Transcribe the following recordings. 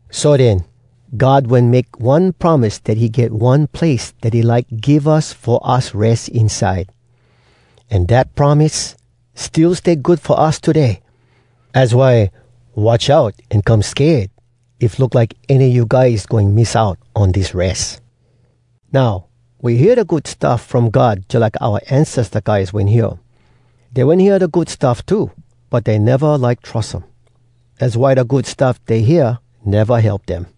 So den, God wen make one promise dat he get one place dat he like give us fo us res inside. An dat promise still stay good fo us today. Az why watch out an come sked if look like any a you guys goin miss out on dis res. Now, we hear da Good Stuff From God jalike oua ancesta guys wen hear um. Dey wen hear da Good Stuff too, but dey neva like trus um. Az why da Good Stuff dey hear neva help dem.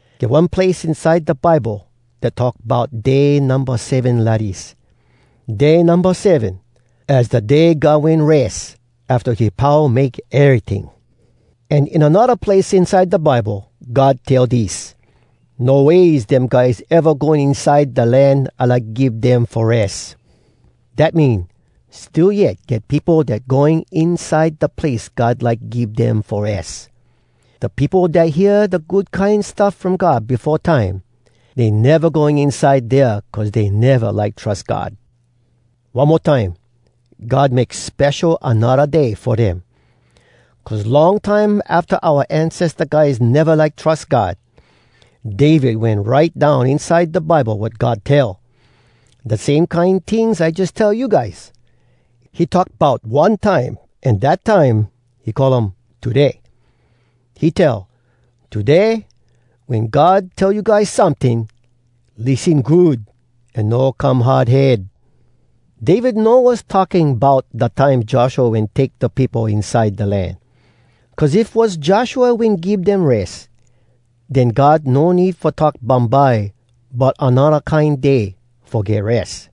Get one place inside da Bible dat talk bout Day Numba Seven lidis: “Day Numba Seven, az da day God wen res, afta he pau make eryting.” An in anodda place inside da Bible, God tell dis: “No ways dem guys eva going inside da land I like give dem fo res!” Dat mean, still yet get peopo dat “going inside da place God like give dem fo res.” Da peopo dat hear da Good Kine Stuff From God befo time, dey neva go inside dea cuz dey neva like trus God. One mo time, God make spesho anodda day fo dem. Cuz long time afta oua ancesta guys neva like trus God, David wen write down inside da Bible wat God tell, da same kine tings I jus tell you guys. He talk bout one time, an dat time, he call um “Today.” He tell: “Today, wen God tell you guys someting, Lissen good an no come hard head!” David no was talking bout da time Joshua wen take da peopo inside da land. Cuz if was Joshua wen give dem res, den God no need fo talk bumbye bout anodda kine day fo get res.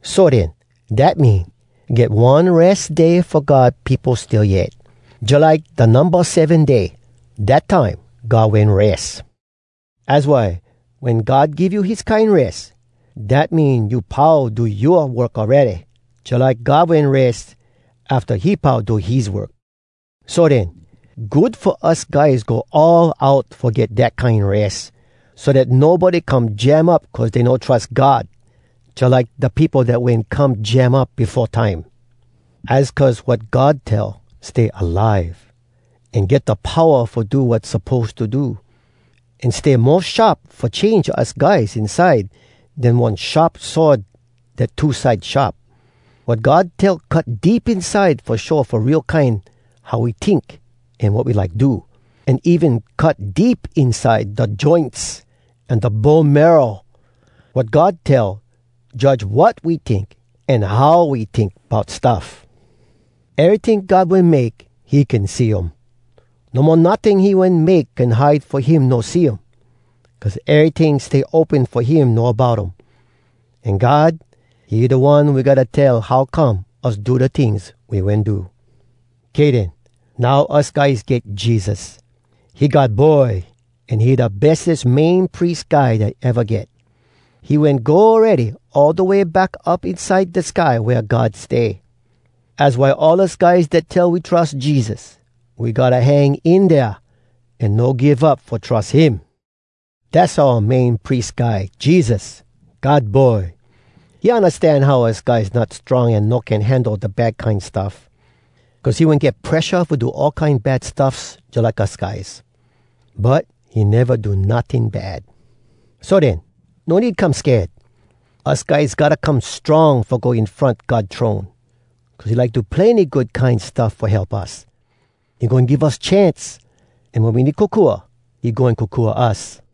So den, dat mean, get one res day fo God peopo still yet, jalike da Numba Seven Day, dat time God wen res. Az why, wen God give you his kine res, dat mean you pau do yoa work awready, jalike God wen res, afta he pau do his work. So den, good fo us guys go all out fo get dat kine res, so dat nobody come jam up cuz dey no trus God, jalike da peopo dat wen come jam up befo time. Az cuz wat God tell stay alive, an get da powa fo do wat suppose to do, an stay mo sharp fo change us guys inside den one sharp sword dat two side sharp. Wat God tell cut deep inside fo show fo real kine how we tink an wat we like do, an even cut deep inside da joints an da bone marrow. Wat God tell judge wat we tink an how we tink bout stuff. Eryting God wen make, he can see um. No mo notting he wen make can hide fo him no see um. Cuz eryting stay open fo him know bout um. An God, he da One we gotta tell how come us do da tings we wen do. Kay den. Now us guys get Jesus. He God Boy, an he da bestes Main Pries Guy dat eva get. He wen go awready all da way back up inside da sky wea God stay! Az why all us guys dat tell we trus Jesus, we gotta hang in dea an no give up fo trus him. Dass oua Main Pries Guy, Jesus, God Boy. He undastan how us guys not strong an no can handle da bad kine stuff. Cuz he wen get presha fo do all kine bad stuffs jalike us guys. But he neva do notting bad! So den, no need come sked. Us guys gotta come strong fo go in front God throne, cuz he like do plenny good kine stuff fo help us. He goin give us chance, an wen we need kokua, he goin kokua us.